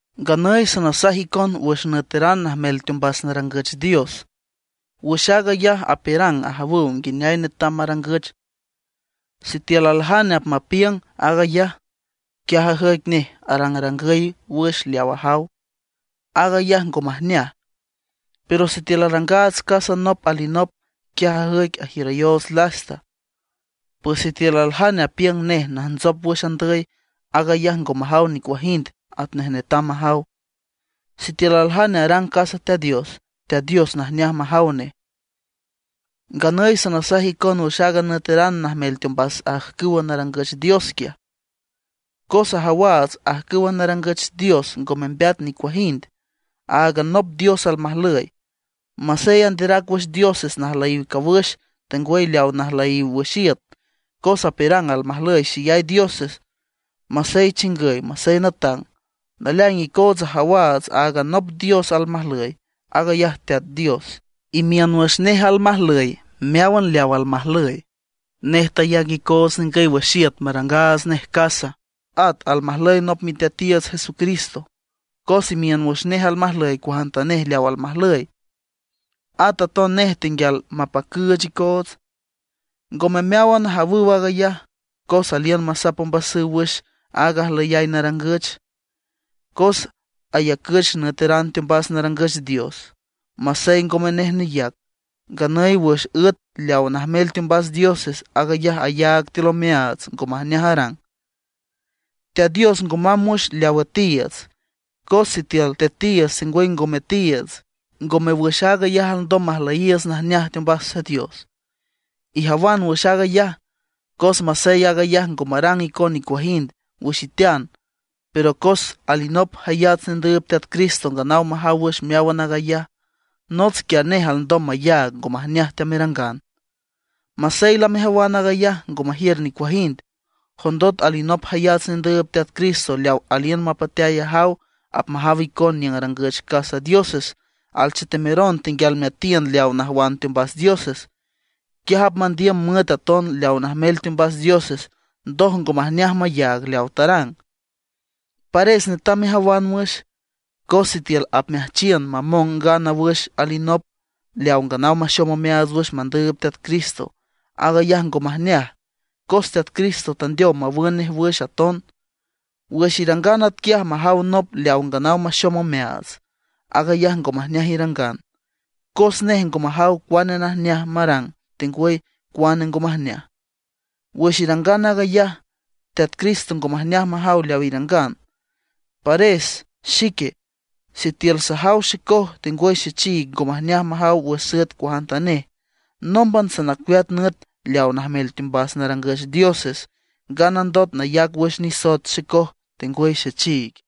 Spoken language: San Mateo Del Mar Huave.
Nganüy sanasaj icon wüx nüeteran najmel teombas narangüch dios. Wüx aag ayaj apiürang ajawüw nguineay netam marangüch. Sitiül aljane apmapiüng aag ayaj, quiaj ajüic nej arangrangüy wüx leaw ajaw, aag ayaj ngo majneaj. Pero sitiül arangaats casa nop alinop, quiaj ajüic ajiürayoots lasta. Pues sitiül aljane apiüng nej najntsop wüx andüy, aag ayaj ngo majaw nicuajind atnej netam majaw. Sitiül aljane arang casa Teat Dios, Teat Dios najneaj majaw nej. Nganüy sanasaj icon wüx aaga nüeteran najmel teombas ajcüw narangüch dios quiaj; cos ajawaats ajcüw narangüch dios ngo membeat nicuajind; áagan nop Dios almajlüy. Masey anderac wüx dioses najlüyiw cawüx, tengwüy leaw najlüyiw wüx iüt, cos apiürang almajlüy xeyay dioses, masey chingüy masey natang. Naleaing icoots ajawaats áagan nop Dios almajlüy, aag ayaj Teat Dios. Imiün wüx nej almajlüy meáwan leaw almajlüy. Nej tayac icoots ningüy wüx iüt marangaats nej casa. At almajlüy nop Miteatiiüts Jesucristo, cos imiün wüx nej almajlüy cuajantanej leaw almajlüy. At aton nej tenguial mapacüüch icoots. Ngome meáwan ajawüw aag ayaj. Cos aliün masap ombasüw wüx aaga ajlüyay narangüch, cos ayacüch nüeteran teombas narangüch dios. Masey ngome nej neyac, nganüy wüx üet leaw najmel teombas dioses, aag ayaj ayaag tiül omeaats ngo majneaj arang. Teat Dios ngo mamb wüx leaw üetiiüts. Cos sitiül tetiiüts tengwüy ngo metiiüts, ngome wüx aag ayaj alndom majlüyiiüts najneaj teombas Teat Dios. Ijawan wüx aag ayaj, cos masey aag ayaj ngo marang icon nicuajind wüx itean, pero cos alinop jayats nendüüb Teat Cristo nganaw majaw wüx meáwan aag ayaj; nots quiaj nej alndom mayaag ngo majneaj teamerangan. Masey lamejawan aag ayaj ngo majiür nicuajind; jondot alinop jayats nendüüb Teat Cristo leaw aliün mapateay ajaw apmajaw icon niüng arangüch casa dioses, alchetemeron tenguial meatiün leaw najwan teombas dioses, quiaj apmandiüm müet aton leaw najmel teombas dioses, ndoj ngo majneaj mayaag leaw tarang. Pares netam mejawan wüx, cos sitiül apmeajchiün mamong ngana wüx alinop leaw nganaw maxom omeaats wüx mandüüb Teat Cristo, aag ayaj ngo majneaj, cos Teat Cristo tandeow mawün nej wüx aton. Wüx irangan atquiay majaw nop leaw nganaw maxom omeaats, aag ayaj ngo majneaj irangan, cos nej ngo majaw cuane najneaj marang tengwüy cuane ngo majneaj. Wüx irangan aag ayaj, Teat Cristo ngo majneaj majaw leaw irangan. Pares xique, sitiül sajaw xecoj tengwüy xechiig ngo majneaj majaw wüx süet cuajantanej, nómban sanacueat nüet leaw najmel teombas narangüch dioses, nganandot nayac wüx nisoet xecoj tengwüy xechiig.